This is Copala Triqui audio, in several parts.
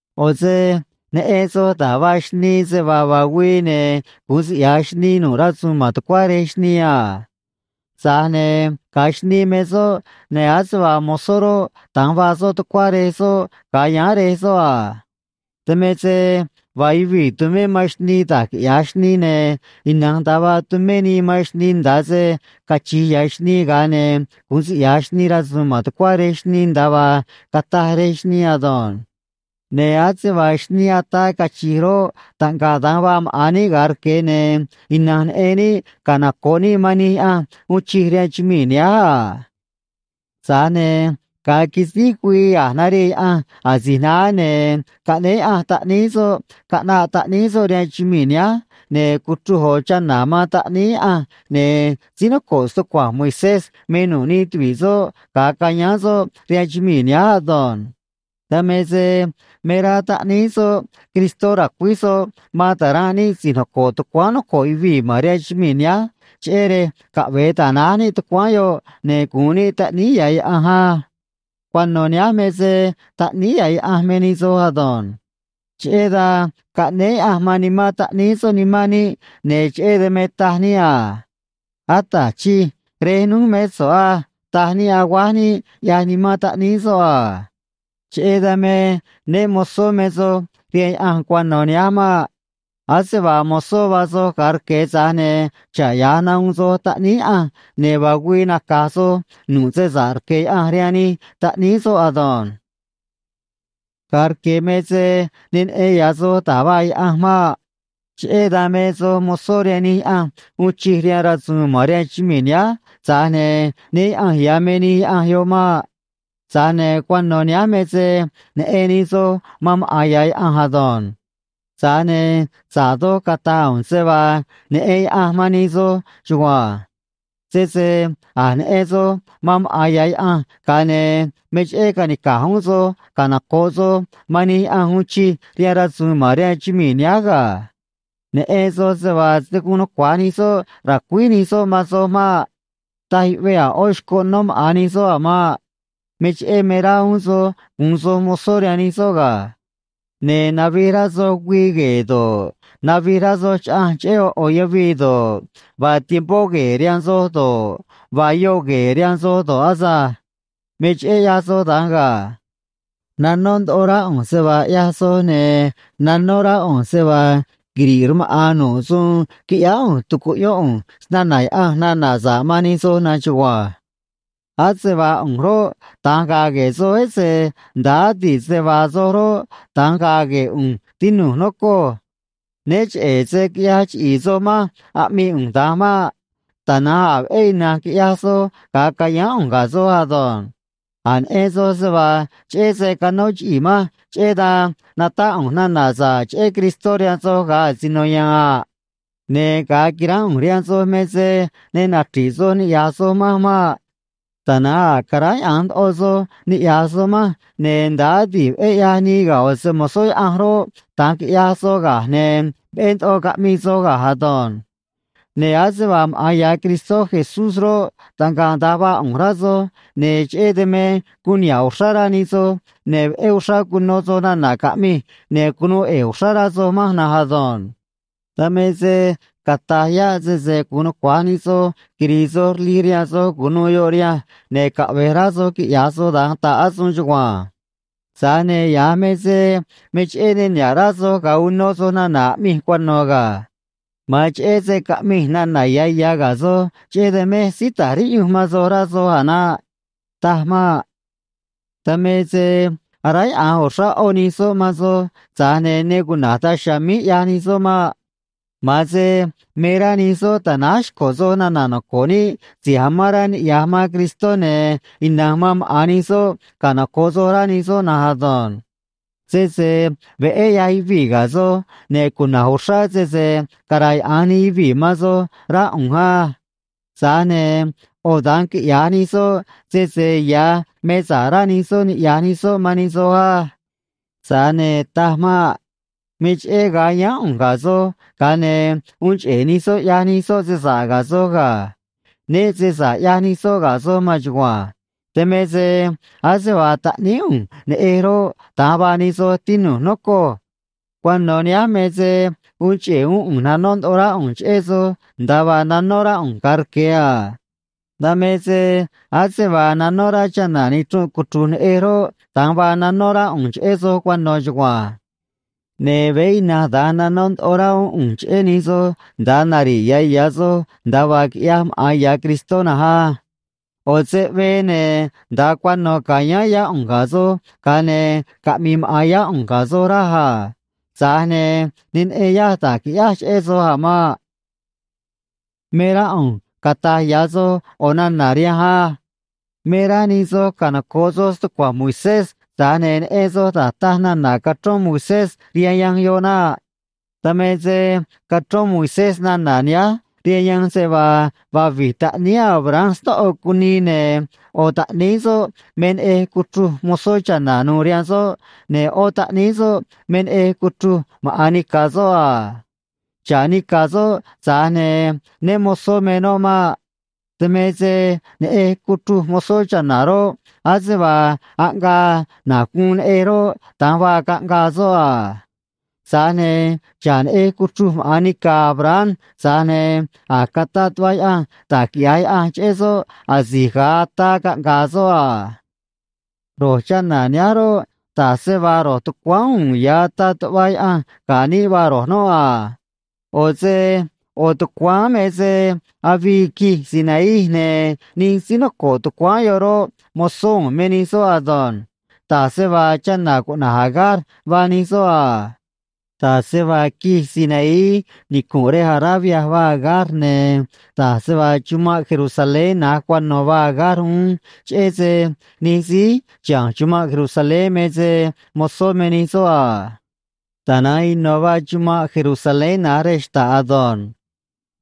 ꞌO̱ se neꞌen soj da̱j vaa xnii, se vaa vaa güii, ne̱ gu̱un siꞌya̱j xnii nu̱ꞌ rasu̱u̱n ma̱n tucuá rej xnii a. Tza̱j ne̱ ga̱a xnii me soꞌ, ne̱ ase vaa mozó roꞌ, da̱nj vaa soꞌ tucuá rej soꞌ ga̱a yáán rej soꞌ a. Dan me se vaa yuvii̱ tumé man xnii da̱j quiꞌya̱j xnii, ne̱ ina̱nj da̱nj vaa tumé nii man xnii nda̱a se cachi̱j ya̱ xnii, ga̱a ne̱ gu̱un siꞌyaj xnii rasu̱u̱n ma̱n tucuá rej xnii nda̱a vaa cataj rej xnii ado̱nj. Ne̱ ase vaa xnii ataa cachi̱j roꞌ, taꞌngaꞌ da̱nj vaa maꞌa̱n níꞌ ga̱a rque̱, ne̱ ina̱nj neꞌen níꞌ canoco̱ꞌ níꞌ man nij yaꞌanj uun chij rihaan chumii̱ nihánj a. Tza̱j ne̱ ga̱a quisíj güii a̱j narii Yaꞌanj asi̱j naá, ne̱ caꞌnéé Yaꞌanj Taꞌníí soꞌ caꞌnaꞌ Taꞌníí soꞌ rihaan chumii̱ nihánj, ne̱ cuchruj ꞌo̱ chana̱ man Taꞌníí Yaꞌanj, ne̱ síí noco̱ꞌ stucua̱nj Moisés me nu̱ꞌ nij tuvi̱ꞌ soꞌ ga̱a cayáán soꞌ rihaan chumii̱ nihánj ado̱nj. Dan me se me rá Taꞌníí soꞌ Cristó ra̱cuíj soꞌ man ta̱ranꞌ níꞌ si̱j noco̱ꞌ tucuáán noco̱ꞌ yuvii̱ ma̱n rihaan chumii̱ nihánj, cheꞌé rej caꞌve̱e ta̱náj níꞌ tucuáán yoꞌ, ne̱ gu̱un níꞌ taꞌníí ya̱ Yaꞌanj á. Cuano̱ nihánj me se taꞌníí ya̱ Yaꞌanj me nij soj ado̱nj. Cheꞌé dan caꞌnéé Yaꞌanj man Nimán Taꞌníí soꞌ nimán níꞌ, ne̱ cheꞌé dan me taj níꞌ a: “Ata̱j Chij, Rej núj mé so̱ꞌ á”, taj níꞌ, aguáj níꞌ, ꞌyaj Nimán Taꞌníí soꞌ a. Cheꞌé dan me né mo̱zó me soj rihaan Yaꞌanj cuano̱ nihánj maꞌ. Ase vaa mozó vaa soj ga̱a rque̱, tza̱j ne̱ xa̱ꞌ ya̱j, nahuun soj taꞌníí Yaꞌanj, ne̱ vaa güii naca̱j soj nu̱ꞌ se sa̱ꞌ rque̱ Yaꞌanj rihaan nij taꞌníí soꞌ ado̱nj. Ga̱a rque̱ me se ne neꞌen ya̱ soj da̱j vaa Yaꞌanj maꞌ. Cheꞌé dan me soj mozó rihaan nij yaꞌanj uun chij rihaan rasu̱u̱n ma̱n rihaan chumii̱ nihánj, tza̱j ne̱ né yaꞌa̱nj ya̱ me nij yaꞌanj yoꞌ maꞌ. Tza̱j ne̱ cuano̱ nihánj me se neꞌen nij soj man maꞌa̱n ya̱ Yaꞌanj ado̱nj. Tza̱j ne̱ sa̱ꞌ doj cata̱j ꞌu̱nj se vaa neꞌen Yaꞌanj man nij soj chugua̱nj. Sese a̱j neꞌen soj man maꞌa̱n ya̱ Yaꞌanj, ga̱a ne̱ me cheꞌé ca̱nica̱j uún soj canoco̱ꞌ soj man nij yaꞌanj uun chij rihaan rasu̱u̱n ma̱n rihaan chumii̱ nihánj ga̱. Neꞌen soj se vaa se̱ guun nucua̱j nij soꞌ ra̱cuíj nij soꞌ man soj maꞌ. Taj yuꞌvee a̱ ꞌó xcoꞌ nó maꞌa̱n nij soꞌ a̱ maꞌ. Me cheꞌé me rá uún soj gu̱un soj mozó rihaan nij soꞌ ga̱. Ne̱ navij rá soj güii gue̱e̱ do̱ꞌ, navij rá soj chaꞌanj cheꞌé ꞌo̱ ꞌo̱ yavii do̱ꞌ, vaa tiempó gue̱e̱ rihaan soj do̱ꞌ, vaa yoꞌ gue̱e̱ rihaan soj do̱ꞌ asânj. Me cheꞌé ꞌyaj soj da̱nj ga̱. Nanó ndoꞌo rá ꞌu̱nj se vaa ꞌyaj soj, ne̱ nanó rá ꞌu̱nj se vaa quiri̱ꞌ rmaꞌa̱n nu̱ꞌ suun quiꞌyáá ꞌu̱nj tucuꞌyón ꞌu̱nj snana̱ Yaꞌanj nana̱ sa̱ꞌ man nij soj na̱nj chugua̱nj. Ase vaa ꞌu̱nj roꞌ, da̱nj ga̱a̱ gue̱e̱ soj, ese nda̱a adi̱ꞌ se vaa soj roꞌ, da̱nj gaa gue̱e̱ ꞌu̱nj, tinu̱j, nocoj. Né cheꞌe̱ se quiꞌyaj chiꞌi̱i̱ soj manj aꞌmii ꞌu̱nj da̱nj maꞌ. Tana̱nj a̱ veꞌé ina̱nj quiꞌyaj soj ga̱a cayáán ꞌu̱nj ga̱ soj ado̱nj. A̱j neꞌen soj se vaa cheꞌé se canó chiꞌii̱ manj, cheꞌé dan natáꞌ ꞌu̱nj nana̱ sa̱ꞌ cheꞌé Cristó rihaan soj ga̱a asino ya̱a̱n a. Ne̱ ga̱a quiránꞌ ꞌu̱nj rihaan soj me se ne nachri̱ꞌ soj ni̱ꞌyaj soj manj maꞌ. Tana̱nj a̱ caráyaꞌa̱nj ndoꞌo soj niꞌya̱j soj manj, ne̱ nda̱a adi̱ꞌ veꞌé ꞌyaj nii ga̱ ꞌo̱ se‑mo̱zó Yaꞌanj roꞌ, da̱nj quiꞌyaj soj, ga̱a ne̱ veꞌé ndoꞌo caꞌmii soj ga̱j ado̱nj. Ne̱ ase vaa maꞌa̱n ya̱ Cristó Jesús roꞌ, taꞌngaꞌ da̱nj vaa ꞌu̱nj, rá soj, ne̱ cheꞌé dan me guun niha̱ꞌ uxrá rá nij soj ne̱ veꞌé uxrá cuno soj nana̱ caꞌmij, ne̱ cunuu ꞌe̱e̱ uxrá rá soj manj na̱nj ado̱nj. Dan me se cata̱j yáꞌ sese guun nucua̱j nij soj quiri̱i̱ soj rlij rihaan soj cu̱nuû yoꞌ rihanj, ne̱ caꞌvej rá soj quiꞌya̱j soj da̱nj, ta̱ꞌ asuun chugua̱nj. Tza̱j ne̱ ya̱j me se me cheꞌé ne niha̱ꞌ rá soj ga̱a uno soj nana̱ aꞌmij cuano̱ ga̱. Ma̱an cheꞌé se caꞌmij nana̱ ya̱ ya̱ ga̱ soj, cheꞌé dan mej síí ta̱j riꞌyunj man soj, rá soj a̱ naꞌ. Taj maꞌ. Dan me se aráyaꞌa̱nj uxrá ꞌó nij soꞌ man soj, tza̱j ne̱ ne cuna̱j daj chiha̱a̱ míj ꞌyaj nij soꞌ maꞌ. Ma̱an se me rá nij soꞌ ta̱náj xco̱ soj nana̱ noco̱ꞌ níꞌ si̱j amán rá niꞌya̱j man Cristó, ne̱ ina̱nj man maꞌa̱n nij soꞌ canoco̱ꞌ soj, rá nij soꞌ na̱nj ado̱nj. Sese veꞌé ꞌyaj yuvii̱ ga̱ soj, ne̱ cuna̱j uxrá sese cara̱yaꞌa̱nj nij yuvii̱ man soj, rá ꞌu̱nj á. Tza̱j ne̱ ꞌo̱ da̱nj quiꞌya̱j nij soꞌ, sese ya̱ me sa̱ꞌ rá nij soꞌ niꞌya̱j nij soꞌ man nij soj á. Tza̱j ne̱ taj maꞌ. Me cheꞌé ga̱a yáán ꞌu̱nj ga̱ soj, ga̱a ne̱ uun cheꞌe̱ nij soꞌ ꞌyaj nij soꞌ se sa̱ꞌ ga̱ soj ga̱. Né se sa̱ꞌ ꞌyaj nij soꞌ ga̱ soj maan chugua̱nj. Dan me se ase vaa taꞌníí ꞌu̱nj neꞌej roꞌ, da̱nj vaa nij soj, tinu̱j, nocoj. Cuano̱ nihánj me se uun cheꞌe̱ uún ꞌu̱nj nanó ndoꞌo rá ꞌu̱nj cheꞌé soj nda̱a vaa nanó rá ꞌu̱nj ga̱a rque̱ a. Dan me se ase vaa nanó rá chana̱ nichrunꞌ cuchru̱j neꞌej roꞌ, da̱nj vaa nanó rá ꞌu̱nj cheꞌé soj cuano̱ chugua̱nj. Ne̱ veé ina̱nj da̱nj nanó ndoꞌo rá uún ꞌu̱nj cheꞌé nij soj nda̱a nari̱ꞌ ya̱ ya̱ soj nda̱a vaa quiꞌyaj maꞌa̱n ya̱ Cristó na̱nj á. ꞌO̱ seꞌvee, ne̱ nda̱a cuano̱ ca̱yáán yá ꞌu̱nj ga̱ soj, ga̱a ne̱ caꞌmi̱i̱ maꞌa̱n yá ꞌu̱nj ga̱ soj, raj a. Tza̱j ne̱ ne neꞌen yaj da̱j qui̱ꞌyáj cheꞌé soj a̱ maꞌ. Me rá ꞌu̱nj cata̱j ya̱ soj ꞌo̱ nana̱ rihanj á: Me rá nij soj canoco̱ꞌ soj stucua̱nj Moisés, tza̱j ne̱ neꞌen soj da̱j taj nana̱ cachrón Moisés rihaan yanj yoꞌ naꞌ. Dan me se cachrón Moisés nana̱ nihánj rihaan yanj, se vaa vaa vi̱j taꞌníí Abraham snóꞌo cunii, ne̱ ꞌo̱ taꞌníí soꞌ me neꞌej cuchruj mozó cha̱na̱ nu̱u̱ rihaan soꞌ, ne̱ ꞌó taꞌníí soꞌ me neꞌej cuchruj maꞌa̱n nica̱ soꞌ a. Xa̱ꞌ nica̱ soꞌ, tza̱j ne̱ né mo̱zó me noꞌ maꞌ. Dan me se neꞌej cuchruj mozó cha̱na̱ roꞌ, ase vaa aꞌngaa na̱j guun neꞌej roꞌ, da̱nj vaa caꞌngaa soꞌ a. Tza̱j ne̱ xa̱ꞌ neꞌej cuchruj maꞌa̱n nica̱ Abraham, tza̱j ne̱ a̱j cataꞌ tuꞌva Yaꞌanj da̱j quiꞌya̱j Yaꞌanj cheꞌé soꞌ asi̱j ga̱a ataa caꞌnga̱a̱ soꞌ a. Ro̱j chana̱ nihánj roꞌ, da̱j se vaa ro̱j tucuáán uun ya̱ ataꞌ tuꞌva Yaꞌanj ga̱ níꞌ vaa ro̱j noꞌ a. ꞌO̱ se ꞌo̱ tucuáán me se avii quij Sinaí, ne̱ nij síí noco̱ꞌ tucuáán yoꞌ roꞌ, mozó u̱u̱n me nij soꞌ ado̱nj. Da̱j se vaa chana̱ cuꞌna̱j Agar vaa nij soꞌ a. Da̱j se vaa quij Sinaí nicu̱nꞌ rej Arabia vaa Agar, ne̱ da̱j se vaa chumanꞌ Jerusalén na̱j cuano̱ vaa Agar uún, cheꞌé se nij síí chiha̱nj chuman' Jerusalén me se mozó me nij soꞌ a. Tana̱nj ino̱ vaa chumanꞌ Jerusalén na̱j rej xta̱ꞌ ado̱nj.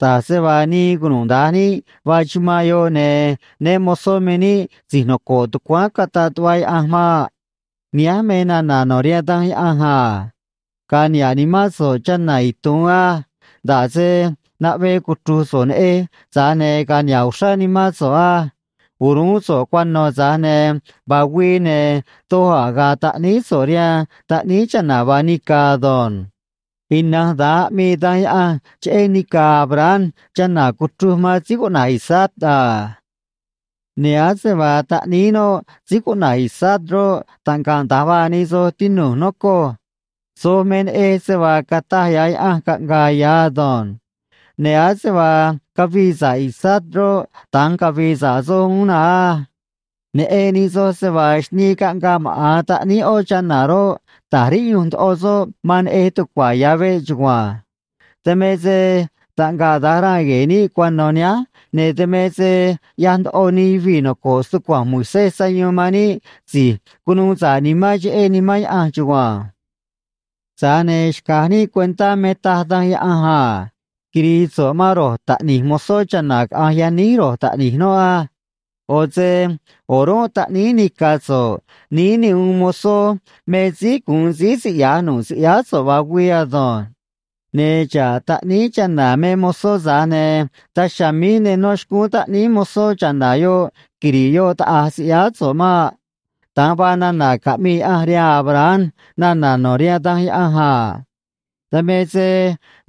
Da̱j se vaa nii cunuda̱nj níꞌ vaa chumanꞌ yoꞌ, ne̱ né mo̱zó me níꞌ si̱j noco̱ꞌ tucuáán cataꞌ tuꞌva Yaꞌanj maꞌ. Nihánj me nana̱ no̱ rihaan Danj Yaꞌanj a: Ga̱a̱ niha̱ꞌ nimán so̱ꞌ, cha̱na̱ itu̱un á. Nda̱ꞌ se naꞌvee cuchru̱j so̱ꞌ neꞌej, tza̱j ne̱ ga̱a̱ niha̱ꞌ uxrá nimán so̱ꞌ á. O̱ruún so̱ꞌ cuano̱, tza̱j ne̱ vaa güii, ne̱ doj a̱ ga̱a̱ taꞌníí so̱ꞌ rihaan taꞌníí chana̱ vaa nica̱ ado̱nj. Ina̱nj da̱nj aꞌmii Danj Yaꞌanj cheꞌé nica̱ Abraham chana̱ cuchruj man síí cuꞌna̱j Isaac a. Ne̱ ase vaa taꞌníí noꞌ síí cuꞌna̱j Isaac roꞌ, taꞌngaꞌ da̱nj vaa nij soj, tinu̱j, nocoj. Soj me neꞌej se vaa cataj ya̱ Yaꞌanj caꞌnga̱a̱ ya̱ ado̱nj. Ne̱ ase vaa cavii sa̱ꞌ Isaac roꞌ, da̱nj cavi̱i̱ sa̱ꞌ soj uún na̱nj á. Neꞌen nij soj se vaa xnii caꞌngaa maꞌa̱n taꞌníí ꞌó chana̱ roꞌ, ta̱j riꞌyunj ndoꞌo soꞌ man neꞌej tucua̱ ya̱ veꞌ chugua̱nj. Dan me se taꞌngaꞌ da̱nj ranꞌ gue̱e̱ níꞌ cuano̱ nihánj, ne̱ dan me se ꞌyaj ndoꞌo nij yuvii̱ noco̱ꞌ stucua̱nj Moisés sayuun man níꞌ si̱j cunuu sa̱ꞌ nimán cheꞌé Nimán Yaꞌanj chugua̱nj. Tza̱j ne̱ xca̱j níꞌ cuentá me taj Danj Yaꞌanj a: “Quiri̱i̱ so̱ꞌ man ro̱j taꞌni̱j mozó cha̱na̱ caꞌa̱nj yaníj ro̱j taꞌni̱j noꞌ á. ꞌO̱ se o̱rúnꞌ taꞌníí nica̱ so̱ꞌ níí ne uun mozó me síí gu̱un síí siꞌya̱j nu̱ꞌ siꞌyáá so̱ꞌ vaa güii ado̱nj. Ne̱ xa̱ꞌ taꞌníí chana̱ me mozó, tza̱j ne̱ daj chiha̱a̱ míj ne nó xcúún taꞌníí mozó cha̱na̱ yoꞌ quiri̱ꞌ yoꞌ taꞌa̱j siꞌyáá so̱ꞌ maꞌ.” Da̱nj vaa nana̱ caꞌmii Yaꞌanj rihaan Abraham nana̱ no̱ rihaan Danj Yaꞌanj a. Dan me se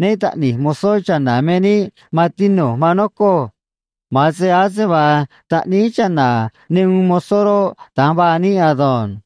né taꞌni̱j mozó cha̱na̱ me níꞌ, maan tinu̱j, maan nocoj. Ma̱an se ase vaa taꞌníí chana̱ ne uun mozó roꞌ, da̱nj vaa níꞌ ado̱nj.